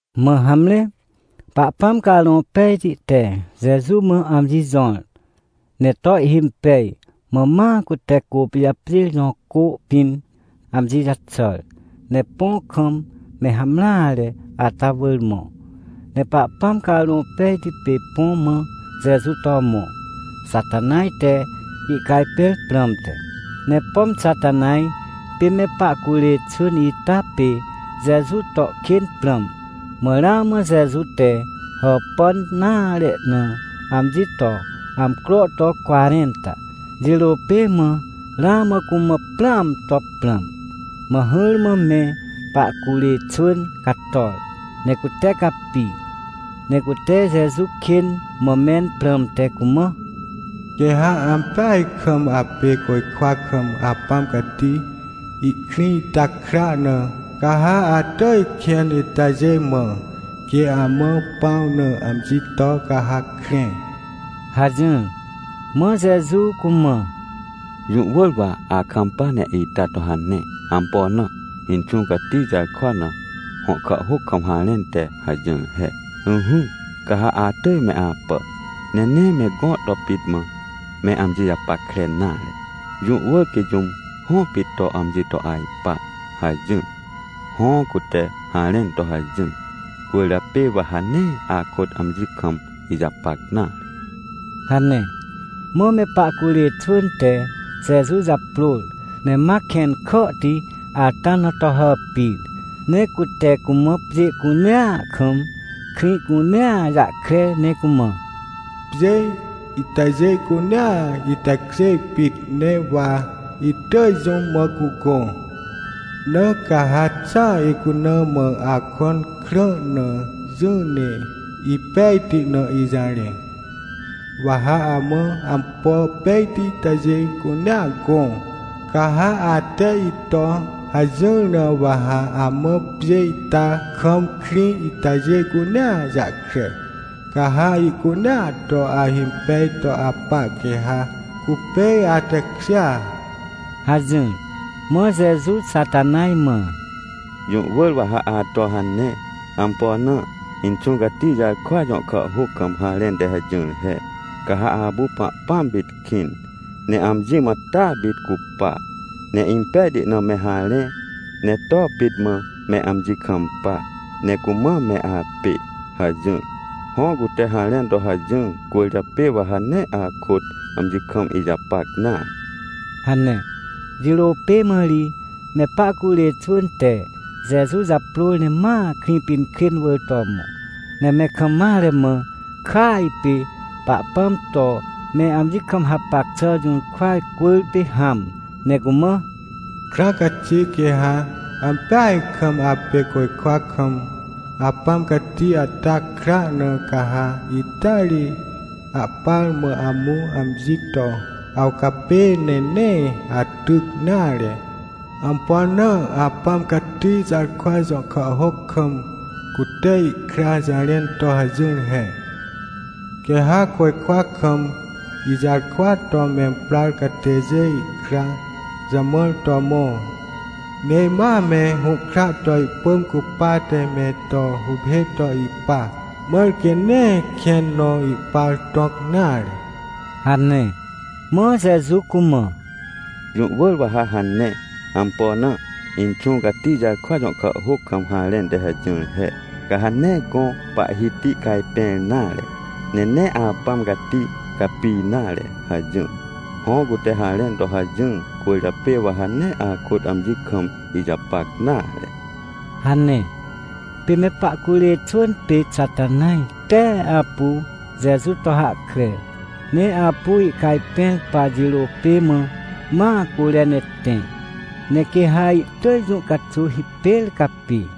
Mã hamre, Pahpãm Carõ Pejti te Jeju mã amji jõr, ne to ihhimpej, mã ma cute Côpijapjêr jõ cô pĩn amji jaxàr, ne põ kam me hamreare ata wỳr mõ. Ne Pahpãm Carõ Pejti pê põ mã Jeju to mõ, Xatanaj te ihcajpẽr prãmte. Ne pom Xatanaj pê me pahcurê xwỳn ita pê Jeju to kên prãm. Mã ramã Jeju te hàpàn nare na amji to amcro to cwarẽnta, jirô pê mã ramã cumã prãam to prãm. Mã hỹrmã me pahcurê xwỳn cator, ne cute capi. Ne cute Jeju kên mã mẽn prãmte cumã: ― Quê ha ampeaj kam apê côjkwa kam Apãm Cati ihkrĩ ita kra na, ca ha atỳj kẽn itajê mã, quê amã pãw na amji to, ca ha krẽ ― hajỹr. Mã Jeju cumã: ― Jũ wỳr wa akampa ne ita to hane. Ampo na? Inxũ Cati jarkwa na, hõ kàhhôc kam harẽn te hajỹr he: “Ỹhỹ, ca ha atỳj me apà, ne nee me gõ to pit mã me amji japackre nare. Jũ wỳr quê jũm hõ pit to amji to ajpa” hajỹr. Hõ, cute harẽn to hajỹr, cwỳrjapê wa ha nee akôt amji kam ijapac nare ― hane. Mã me pahcurê xwỳn te Jeju japrôr, ne ma kẽn kàhti ata na to hàpir. Ne cute cumã pjê cunea kam, krĩ cunea jahkre, ne cumã: ― Pjê itajê cunea itekjê pit, ne wa itỳj jũm mã cugõ. Na ca ha xa icuna mã akõn krã na jỹ ne ipejti na ijarẽ, wa ha amã ampo pejti itajê cunea gõ. Ca ha ate ito hajỹr na, wa ha amã pjê ita kam krĩ itajê cunea jahkre, ca ha ihcunea to ahimpej to apa, quê ha cupê atekjêa ― hajỹr. Mã Jeju Xatanaj mã: ― Jũ wỳr wa ha ato hane. Ampo na? Inxũ Cati jarkwa jõ kàhhôc kam harẽn te hajỹr he: “Ca ha apu Pahpãm pit kĩn, ne amji mã taa pit cupa, ne impejti na me harẽ, ne to pit mã me amji kampa, ne cumã me apê” hajỹr. Hõ, cute harẽn to hajỹr, cwỳrjapê wa ha nee akôt amji kam ijapac nare ― hane. Jirô pê mã ri me pahcurê xwỳn te Jeju japrôr ne ma Krĩpinkrên wỳr to mõ, ne me kam mare mã, kỳaj pê Pahpãm to me amji kam hapac xà jũrkwa cwỳrpê hãm, ne cumã: ― Krãa caxi, quê ha ampeaj kam apê côjkwa kam Apãm Cati ata kra na, ca ha ita ri ahpar mã amũ amji to awcapê, ne nee atyc nare. Ampo na? Apãm Cati jarkwa jõ kàhhôc kam, cute ihkra jarẽn to hajỹr he: “Quê ha côjkwa kam ijarkwa to memprar catêjê ikra jamãr to mõ, ne ma me hũhkra to ihpỳm cupate me to huphê to ipa, mãr quê nee kẽn nõ ihpar tõc nare” ― hane. Mã Jeju cumã: ― Jũ wỳr wa ha hane. Ampo na? Inxũ Cati jarkwa jõ kàhhôc kam harẽn te hajỹr he: “Ca ha nee gõ Pahhiti cajpẽr nare, ne nee Apãm Cati capi nare” hajỹr. Hõ, cute harẽn to hajỹr, cwỳrjapê wa ha nee akôt amji kam ijapac nare ― hane. Pê me pahcurê xwỳn pê Xatanaj tee apu Jeju to hahkre, ne apu ihcajpẽr pa jirô pê mã, ma cure ne tẽ, ne quê ha ihtỳj jũ caxuw hipêr capi.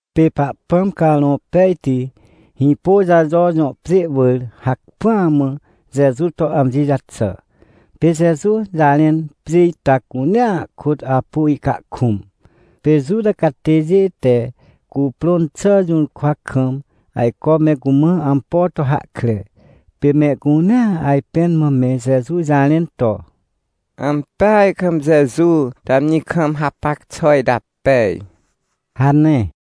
Pê Pahpãm Carõ Pejti Hĩpôjajo jõ pjê wỳr hacpỹa mã Jeju to amji jaxà. Pê Jeju jarẽn pjê ita cunea kôt apu ihcahkũm. Pê Juta catêjê te cuprõn xà jũrkwa kam ajco me cumã ampo to hahkre. Pê mehcunea ajpẽn mã me Jeju jarẽn to: ― Ampeaj kam Jeju te amji kam hapac xà ita pej ― hane.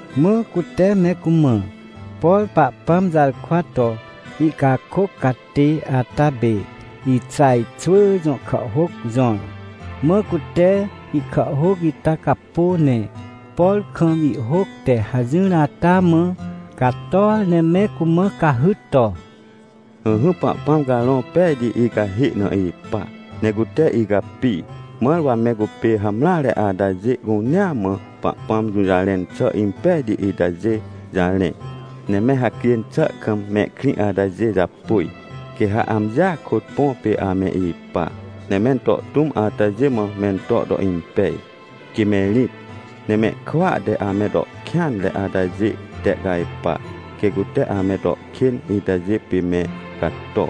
Mã cute me cumã, por Pahpãm jarkwa to ihcakôc catê ata pê Ixaj xwỳ jõ kàhhôc jõr. Mã cute ihkàhhôc ita capô, ne por kam ihhôc te hajỹr ata mã cator ne me cumã cahyt to: “Ỹhỹ, Pahpãm Carõ Pejti icahê na ipa, ne cute icapi, mãr wa me cupê hamreare atajê cunea mã Pahpãm jũjarẽn xà impejti itajê jarẽ. Ne me hacjên xà kam mehkrĩ atajê japôj, quê ha amjia kôt põ pê ame ipa. Ne mento tũm atajê mã mento to impej, quê me rĩt. Ne mehkwỳa te ame to kêanre atajê tehcajpa, quê cute ame to kên itajê pê me cato.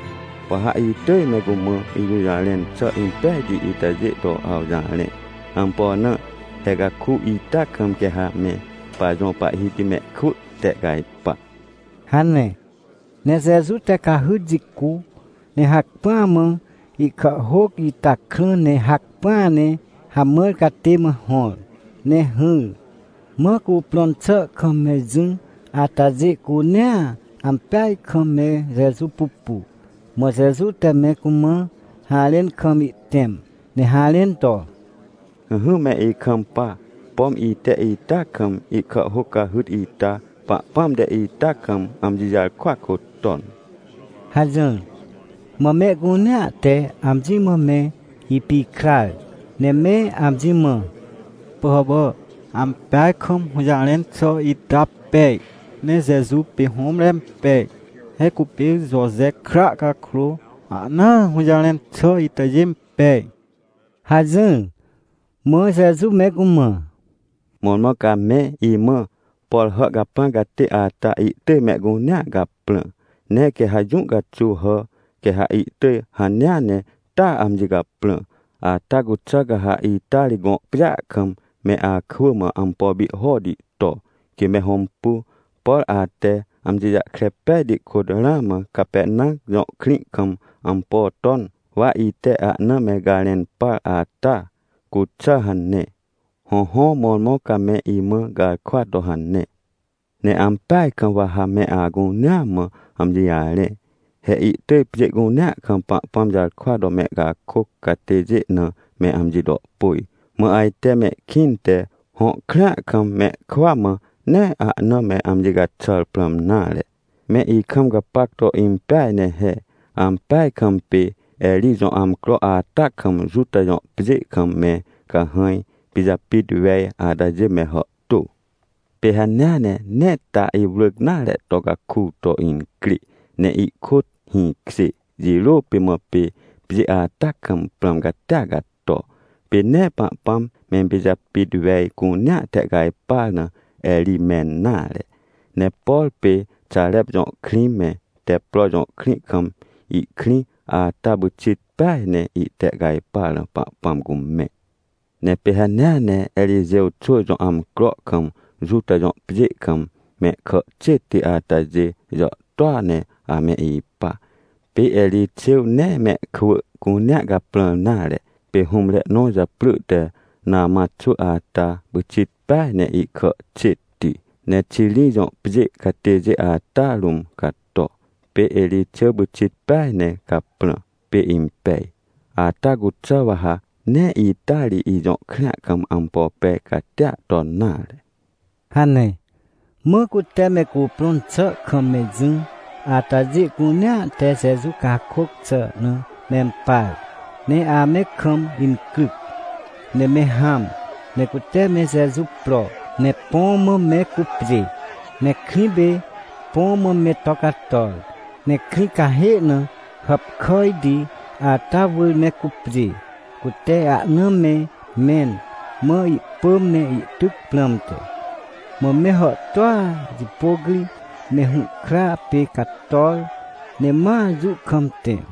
Wa ha itỳj me cumã ijũjarẽn xà impejti itajê to awjarẽ. Ampo na? He caku ita kam quê ha me pajõ Pahhiti mehkwỳ tehcajpa” hane. Ne Jeju te cahyt jicu, ne hacpỹa mã ihkàhhôc ita krã ne hacpỹa ne hamãr catê mã hõr, ne hỹr. Mã cuprõn xà kam me jỹ atajê cunea ampeaj kam me Jeju pupu. Mã Jeju te me cumã harẽn kam ihtẽm, ne harẽn to: ― Ỹhỹ, me ikampa. Pom ite ita kam ihkàhhôc cahyt ita, Pahpãm te ita kam amji jarkwa kôt ton ― hajỹr. Mã mehcunea te amji mã me ipikrar ne me amji mã: ― Pỳhàpà, ampeaj kam hũjarẽn xà ita pej, ne Jeju pê hũmre impej. He cupê Joje kra cakrô, ahnaa hũjarẽn xà itajê impej ― hajỹr. Mã Jeju me cumã: ― Mõrmõ ca me imã: “Por hà caprãr catê ata ihtỳj mehcunea caprã, ne quê ha jũ caxuw hà, quê ha ihtỳj hanea ne taa amji caprã. Ata cuxà ca ha ita ri, gõ pjêa kam me akwỳ mã ampo pihhoti to, quê me hõmpu. Por ate amji jahkre pejti kôt ramã Capernam jõ krĩ kam ampo ton, wa ite ahna me garẽn par, ata cuxà” hane. Hõhõ, mõrmõ ca me imã garkwa to hane. ― Ne ampeaj kam wa ha me acunea mã amji jarẽ. He ihtỳj pjê cunea kam Pahpãm jarkwa to mehcakôc catêjê na me amji to pôj, mã ajte mehkĩnte, hõ krĩa kam mehkwỳa mã nee ahna me amji caxàr prãm nare. Me ikam gapac to impeaj ne he. Ampeaj kam pê Erij jõ amcro ata kam, Juta jõ pjê kam me cahãj pijapit wej atajê me hàhtô. Pê hanea ne nee ta iwrỳc nare to caku to incrê ne ihkôt hĩkjê jirô pê mã, pê pjê ata kam prãm catia cato. Pê nee Pahpãm mempijapit wej cunea tehcajpar na Erij mẽn nare. Ne por pê Xarep jõ krĩ me, Teppro jõ krĩ kam ihkrĩ ata, pyxit peaj ne ihtehcajpar na Pahpãm cumẽ. Ne pê hanea ne Erixêw xwỳ jõ amcro kam, Juta jõ pjê kam, mehkà xêtti atajê jàhtôa ne ame ipa. Pê Erixêw nee mehkwỳ cunea caprãr nare. Pê hũmre nõ japrỳ te Namã xwỳ ata pyxit peaj ne ihkà xêtti, ne Xiri jõ pjê catêjê ata rũm cato. Pê Erixêw pyxit peaj ne caprã, pê impej. Ata cuxà wa ha nee ita ri, ijõ krĩa kam ampo pej catia ton nare ― hane. Mã cute me cuprõn xà kam me jỹ atajê cunea te Jeju cakôc xà na mempar, ne ame kam incryc. Ne me hãm, ne cute me Jeju pro, ne põ mã me cupjê. Ne krĩ pê, põ mã me to cator, ne krĩ cahê na hàpkàjti ata wỳr me cupjê, cute ahna me mẽn, mã ihpỳm ne ihtyc prãmte. Mã me hàhtôa jipôc ri me hũhkra pê cator, ne ma jũ kam tẽ.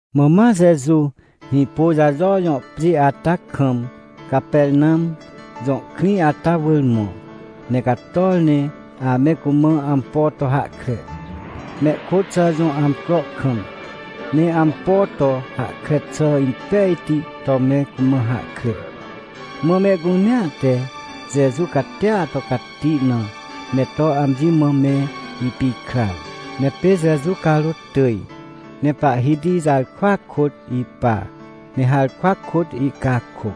Mã ma Jeju Hĩpôjajo jõ pjê ata kam, Capernam jõ krĩ ata wỳr mõ, ne cator ne ame cumã ampo to hahkre, mehkôt xà jõ amcro kam. Ne ampo to hahkre xà impejti to me cumã hahkre. Mã mehcunea te Jeju catia to cati na me to amji mã me ipikrar. Ne pê Jeju carôt tỳj, ne Pahhiti jarkwa kôt ipa, ne harkwa kôt ihcakôc.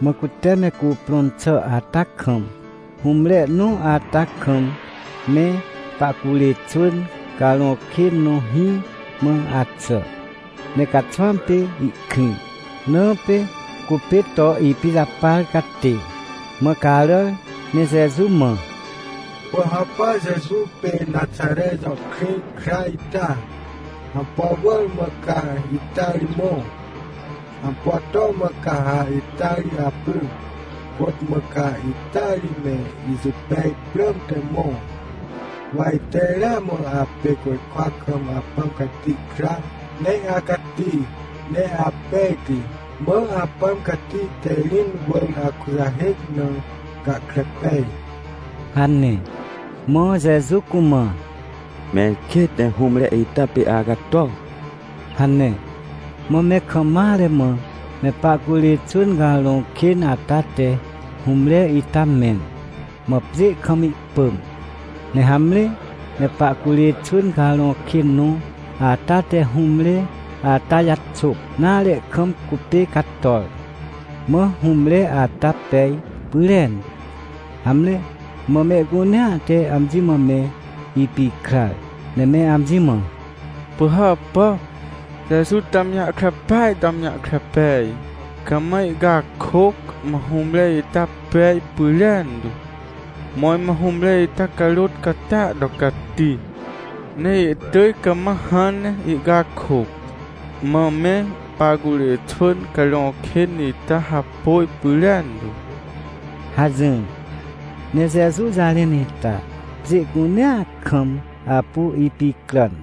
Mã cute me cuprõn xà ata kam, hũmre nõ ata kam, me pahcurê xwỳn carõ kên nõ hĩ mã axà, ne caxwãm pê ihkrĩ, na pê cupê to ipijapar catê. Mã caràr, ne Jeju mã: ― Pỳhàpà, Jeju pê Naxare jõ krĩ kra ita, ampo wỳr mã ca ita ri mõ? Ampo to mã ca ha ita ri apu? Côt mã ca ita ri me ijipej prãmte mõ? Wa ite ramã apê côjkwa kam Apãm Cati kra, ne acati, ne apejti, mã Apãm Cati te rĩn wỳr akujahêc na, gahkre pej ― hane. Mã Jeju cumã: ― Mẽr kêt! Ne hũmre ita pê acato! ― hane. Mã me kam mare mã me pahcurê xwỳn carõ kên ata te hũmre ita mẽn, mã pjê kam ihpỳm. Ne hamre, me pahcurê xwỳn carõ kên nõ ata te hũmre ata jaxôp nare kam cupê cator. Mã hũmre ata pej pyrentu. Hamre, mã mehcunea te amji mã me ipikrar, ne me amji mã: ― Pỳhàpà, Jeju te amji jahkre peaj to amji jahkre pej, cama ihcakôc, mã hũmre ita pej pyrentu. Mõrmõ hũmre ita carôt catia to cati, ne ihtỳj cama hãn ne ihcakôc, mã me pahcurê xwỳn carõ kên ita hapôj pyrentu ― hajỹr. Ne Jeju jarẽn ita pjê cunea kam apu ipicràn.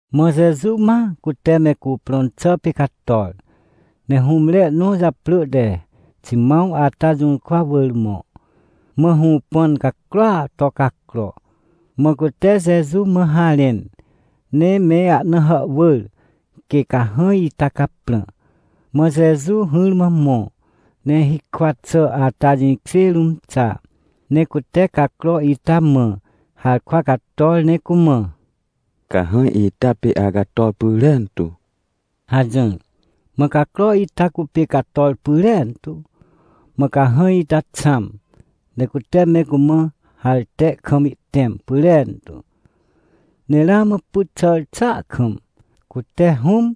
Mã Jeju ma cute me cuprõn xà pê cator, ne hũmre nõ japrỳ te Ximãw ata jũrkwa wỳr mõ, mã hũpãn cacroa to cacro. Mã cute Jeju mã harẽn, ne me ahna hàhwỳr quê cahãj ita caprã. Mã Jeju hỹrmã mõ, ne hikwa xà ata jĩkjê rũm xa, ne cute cacro ita mã harkwa cator ne cumã: ― Cahãj ita pê acator pyrentu! ― hajỹr. Mã cacro ita cupê cator pyrentu, mã cahãj ita xãm, ne cute me cumã harte kam ihtẽm pyrentu. Ne ramã pyt xàr xàa kam, cute Hũm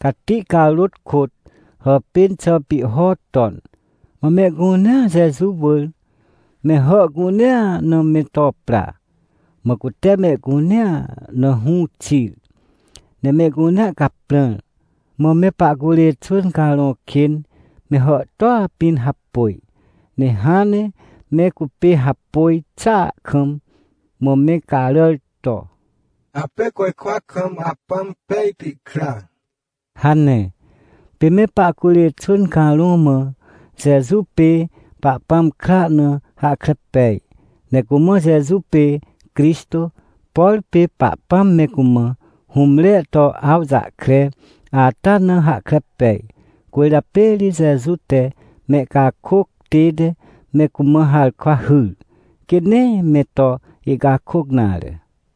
Cati carôt kôt hàpên xà pihho ton. Mã mehcunea Jeju wỳr me hà cunea na me to pra. Mã cute mehcunea na hũ xir, ne mehcunea caprãr. Mã me pahcurê xwỳn carõ kên me hàhtôa pĩn hapôj, ne hãn ne me cupê hapôj xàa kam mã me caràr to: ― Apê côjkwa kam Apãm pejti kra ― hane. Pê me pahcurê xwỳn carõ mã Jeju pê Pahpãm kra na hahkre pej. Ne cumã Jeju pê Crixtô, por pê Pahpãm me cumã hũmre to awjahkre ata na hahkre pej. Cwỳrjapê ri Jeju te mehcakôc tête me cumã harkwa hyr, quê nee me to ihcakôc nare.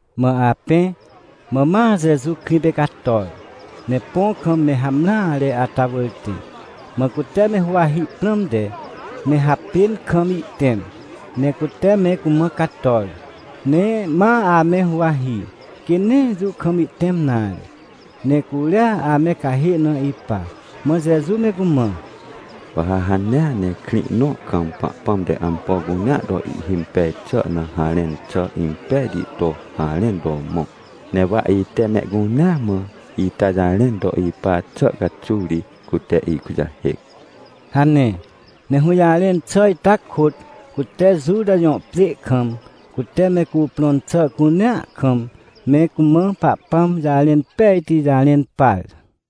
Mã apẽ, mã ma Jeju krĩ pê cator, ne põ kam me hamreare ata wỳr tẽ. Mã cute me huwahi prãmte, me hapên kam ihtẽm, ne cute me cumã cator. Ne ma ame huwahi, quê nee jũ kam ihtẽm nare, ne curia ame cahê na ipa. Mã Jeju me cumã: ― Wa ha hanea ne krĩ nõ kam, Pahpãm te ampo cunea to ihhimpej xà na harẽn xà impejti to harẽn to mõ. Ne wa ite mehcunea mã ita jarẽn to ipa xà caxuw ri cute ikujahêc ― hane. Ne hũjarẽn xà ita kôt, cute Juta jõ pjê kam, cute me cuprõn xà cunea kam, me cumã Pahpãm jarẽn pejti jarẽn par.